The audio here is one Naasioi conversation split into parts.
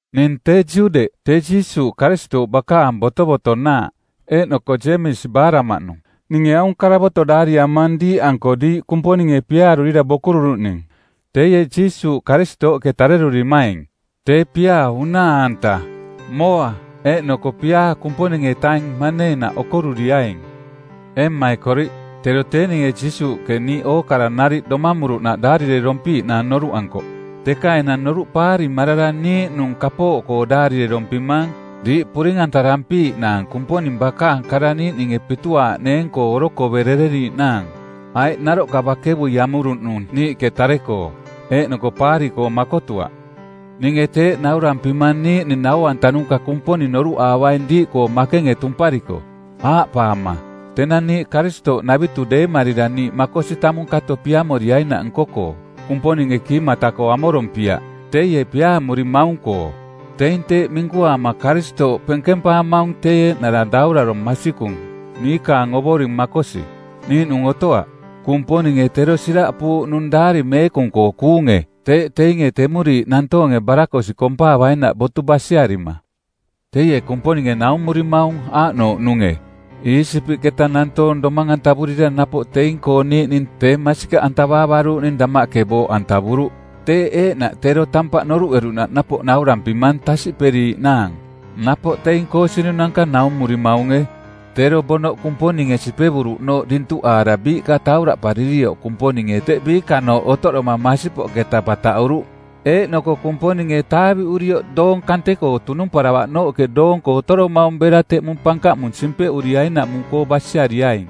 Ning tee Juudeꞌ, tee Jiisuuꞌ Karistooꞌ bakaang botovotonaaꞌ eeꞌnoko Jeemisi baaraꞌmaꞌnung. Ninge aung karavoto˜ daariamang diiꞌanko diiꞌ Kumponinge piaarurira bokururuꞌning, teie Jiisuuꞌ Karistooꞌke tarerurimaing. Tee piaa unaa-anta, mooa, eeꞌnoko piaa Kumponing-etaing maneenaꞌ okoruriaing. Ee mmaikoriꞌ, tero tee ninge Jiisuuꞌke niiꞌ ookara nariꞌ domamuruꞌnaꞌ daarirerompiiꞌnaang noruꞌankoꞌ, teka enang noruꞌ paarimarara niiꞌnung kapooꞌkoo daarirerompimang diiꞌ puring-antarampiiꞌnaang Kumponing bakaang kara niiꞌninge pituaaꞌneeng-koo orokoverereriiꞌnaang, aiꞌ naroꞌka bakevui amuruꞌnung niiꞌke tare-koo, eeꞌnoko paari-koo makotuaꞌ. Ninge teeꞌ naurampimang niiꞌning nau-antanuka Kumponing noruꞌaavaing diiꞌkoo makenge tumpariko, aaꞌpaama, “Tenang niiꞌ Karistooꞌnavitu deemarira niiꞌ makosi tamung kato piamoriainaꞌ nko-koo, Kumponinge kiimata-koo amorompiaꞌ, teie piaamurimaung-koo.” Teing teeꞌ minkuaama Karistooꞌ penkempaamaung tee eeꞌnara daurarong˜ masikung, niikaang Ovoring makosi, niiꞌnung otoaꞌ. Kumponinge tero siraꞌpuuꞌnung Daari Meekung-koo kuunge teeꞌ teinge temuriiꞌ nantoonge barakosiꞌ kompaavainaꞌ botu basiarima. Teie Kumponinge naumurimaung aaꞌnouꞌnunge: Iisipiꞌketa nantoong domang-antavurira napoꞌ teing-koo niiꞌning tee masikaꞌantavaavaruuꞌning damaꞌke booꞌantavuruꞌ. Teeꞌ eeꞌnaꞌ tero tampaꞌ noruꞌeruꞌnaꞌ napoꞌ nauramping tasiꞌperiiꞌnaang. Napoꞌ teing koosinunanka naumurimaunge. Tero bonoꞌ Kumponinge sipevuruꞌnooꞌ dintuꞌaara biiꞌka tauraꞌparirioꞌ Kumponinge teꞌ biikanooꞌ otoꞌdoma masipoꞌketa bataꞌuruꞌ. Eeꞌnoko Kumponinge taaviꞌurioꞌ doong kante-koo tunumparavaꞌnooꞌke doonko otoromaung bera teꞌmung pankaꞌmung simpeꞌuriainaꞌmung-koo basiariaing.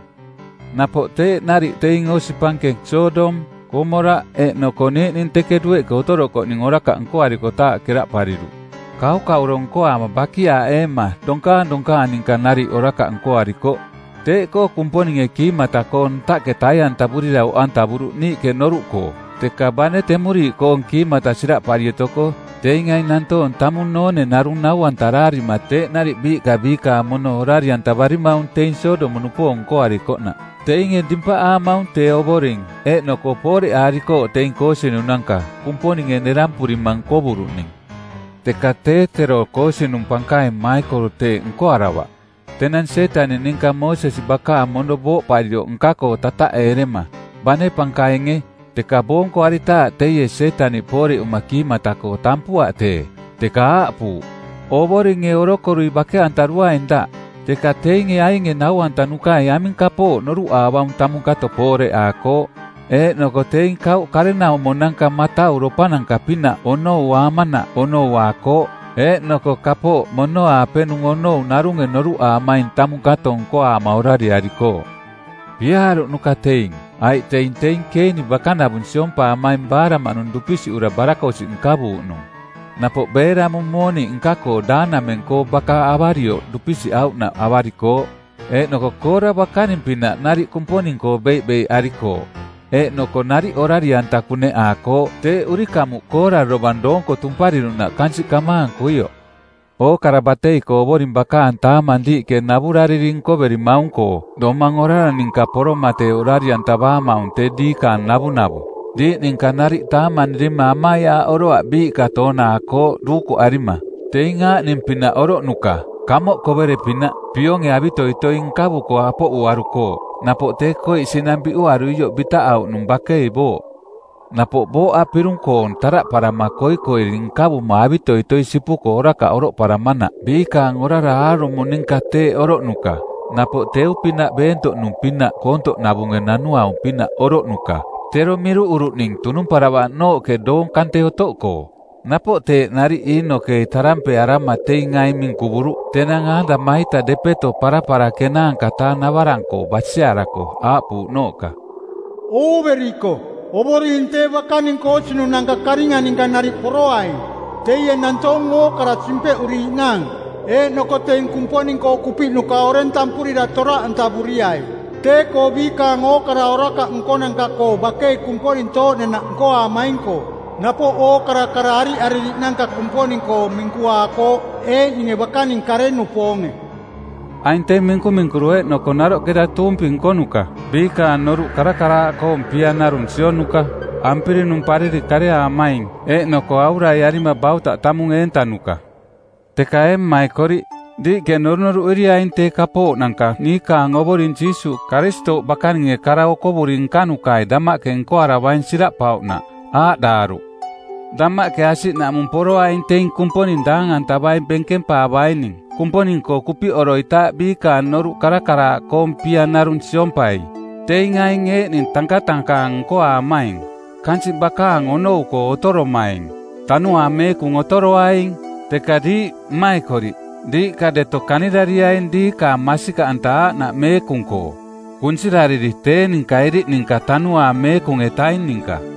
Napoꞌ teeꞌ nariꞌ teing osi pankeng Sodom, Komoraꞌ, eeꞌnoko niiꞌning teke dueꞌke otorokoꞌning orakaꞌ nkoarikotaaꞌ keraꞌpariruꞌ. Kaukauro nkoaama bakiaaꞌeema donkaang donkaang ninka nariꞌ orakaꞌ nkoarikoꞌ. Teeꞌkoo Kumponinge kiimata-koo ntaꞌke tai-antavurira oꞌantavuruꞌ niiꞌke noruꞌkoo. Teka bane temuriiꞌkoong kiimata siraꞌpari otoko, teing aing nantoong tamung noone narung nau-antaraarima teeꞌ nariꞌ biiꞌka biikaang mono orari-antavarimaung teing Sodom-nupoong nkoarikoꞌnaꞌ. Teinge dimpaꞌaamaung tee Ovoring, eeꞌnoko pooreꞌaarikooꞌ teing koosinunanka˜ Kumponinge nerampurima nkovuruꞌning. Teka tee tero koosinung pankaing Maikol teeꞌ nkoaravaꞌ. Tenang Sietaniꞌ ninka Moosesi bakaang mono booꞌparioꞌ nka-koo tataꞌeerema, bane pankainge, teka boonkoaritaaꞌ teie Sietaniꞌ pooreꞌuma kiimata-koo tampuaꞌ tee, teka aaꞌpuuꞌ, “Ovoringe orokorui bake-antaruaing daꞌ.” Teka teinge ainge nau-antanukai aming kapooꞌ noruꞌaavaung tamung kato pooreꞌaakooꞌ. Eeꞌnoko teing kauꞌ karenaumonanka matauropananka-pinaꞌ onouaamanaꞌ onouaakooꞌ. Eeꞌnoko kapooꞌ mono-aapenung onoue narunge noruꞌaamaing tamung kato nkoaama orariarikooꞌ. Piaaruꞌnuka teing, aiꞌ teing teing Keiniꞌ bakanavung siompaamaing baaraꞌmaꞌnung dupisiꞌura barakosiꞌ nkavuuꞌnung. Napoꞌ Beelamu mooniꞌ nka-koo daanameng-koo baka avarioꞌ dupisiꞌauꞌnaꞌ avarikooꞌ. Eeꞌnoko Koora bakaning-pinaꞌ nariꞌ Kumponing-koo beiꞌbeiꞌarikooꞌ, eeꞌnoko nariꞌ orari-anta kuneꞌaakooꞌ teeꞌ urikamuꞌ Koora dovang doonko tumpariruꞌnaꞌ kansiꞌ kamaankuioꞌ. Ookara batei-koo Ovoring bakaang taamang diiꞌke navurariri nkoverimaung-koo domang orara ninka poroma tee orari-antavaamaung tee diikaang navunavu. Diiꞌ ninka nariꞌ taamanirima amaiaaꞌoroaꞌ biiꞌka toonaakooꞌ duukuꞌarima. Teing aaꞌning-pinaꞌ oroꞌnuka: kamoꞌ kovere-pinaꞌ, pionge avitoitoi nkavuko apoꞌuarukooꞌ. Napoꞌ tee koiꞌ sinang biꞌuaruioꞌ bitaꞌauꞌnung bakei booꞌ. Napoꞌ booꞌa pirung-koong taꞌdaꞌparama koikoiri nkavuma avitoitoi sipuko orakaꞌ oroꞌparamanaꞌ biikaang orara aarumo ninka teeꞌ oroꞌnuka. Napoꞌ teu-pinaꞌ beentoꞌnu-pinaꞌ koontoꞌnavunge nanuau-pinaꞌ oroꞌnuka tero miruꞌuruꞌning tunumparavaꞌnooꞌke doong kante otoꞌkoo. Napoꞌ teeꞌ nariꞌ Iinokei tarampeearama˜ teing aing minkuvuruꞌ tenang Aadama-ita depeto parapara ˜kenaanka-taa navarang-koo basiarako aaꞌpuuꞌnooꞌka, “Ooveriko, Ovoring tee bakaning koosinunanka karinga ninka nariꞌ poroaing. Teie nantoong ookara simpeꞌuriiꞌnaang eeꞌnoko teing Kumponing-koo kupiꞌnuka oreng tampurira toraꞌantavuriai tee-koo biikaang ookara orakaꞌ nkonanka-koo bakei Kumponing tooꞌdenaꞌ nkoaamaing-koo, napoꞌ ookara kara ariꞌaririꞌnanka Kumponing-koo minkuaakooꞌ eeꞌninge bakaning kare-nupoonge.” Aing teing minkuminkuru eeꞌnoko naroꞌketa tuumpi nkonuka, biikaang noruꞌ karakaraaꞌkoong pia narung sionuka, ampirinumpariri kareaamaing, eeꞌnoko auraiarima bautaꞌ tamung eentanuka. Teka ee mmaikoriꞌ, diiꞌke norunoruꞌeriaing tee kapooꞌnanka niikaang Ovoring Jiisuuꞌ Karistooꞌ bakaninge kara okovuri nkanukai damaꞌke nkoaravaing siraꞌpauꞌnaꞌ. Aaꞌdaaruꞌ, “Damaꞌke asiꞌnamuꞌ poroaing teing Kumponing daang-antavai benkempaavaining Kumponing-koo kupiꞌoroitaaꞌ biikaang noruꞌ karakaraaꞌkoong pia narung siompai.” Teing aing eeꞌning tankatankaang nkoaamaing, kansiꞌ bakaang onou-koo otoromaing, Tanuaang Meekung otoroaing. Teka diiꞌ, mmaikoriꞌ, diiꞌka deto kanirariaing diikaang masikaꞌanta aaꞌnaꞌ meekung-koo. Kunsirariri tee ninka iriꞌ ninka Tanuaang Meekung-etaing ninka.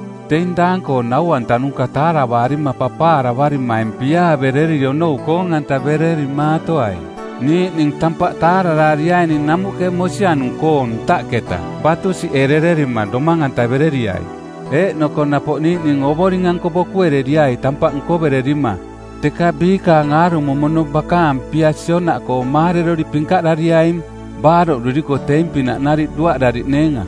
Teing daang-koong nau-antanuka taaravaarima papaaravarimaing piaaverereri onou koong-antavererimaatoai. Niiꞌning tampaꞌ taararaariaining namuꞌke mosianung-koong ntaꞌketa batusiꞌerererima domang-antavereriai. Eeꞌnoko napoꞌ niiꞌning Ovoring-anko bokuereriai tampaꞌ nkoverererima, teka biikaang aarumo mono bakaang pia sionaꞌkoo maarerori pinkaꞌdariaing, baaroꞌduriko teing pinaꞌ nariꞌ duaꞌdariꞌneenga.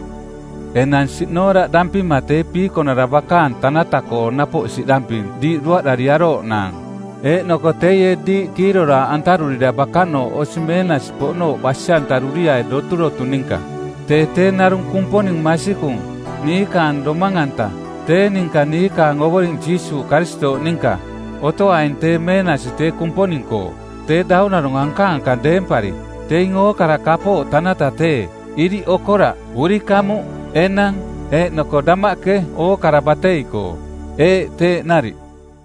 Enang siꞌnooraꞌdampima tee Piikonara bakaang tanata-koo napoꞌ siꞌdamping diiꞌ duaꞌdariarooꞌnaang. Eeꞌnoko teie diiꞌ kiiroraaꞌantarurira bakanooꞌ osi meenasi-poꞌnooꞌ basi-antaruriai doturotu ninka. Tee tee narung Kumponing masikung, niikaang domang-anta, tee ninka niikaang Ovoring Jiisuuꞌ Karistooꞌ ninka. Otoaing tee meenasi tee Kumponing-koo, tee daurarong anka-ankang deempari, teing ookara kapooꞌ tanata tee, iriꞌ okoraꞌ – urikamuꞌ, enang, eeꞌnoko damaꞌke ookara batei-koo. Eeꞌ, teeꞌ nariꞌ.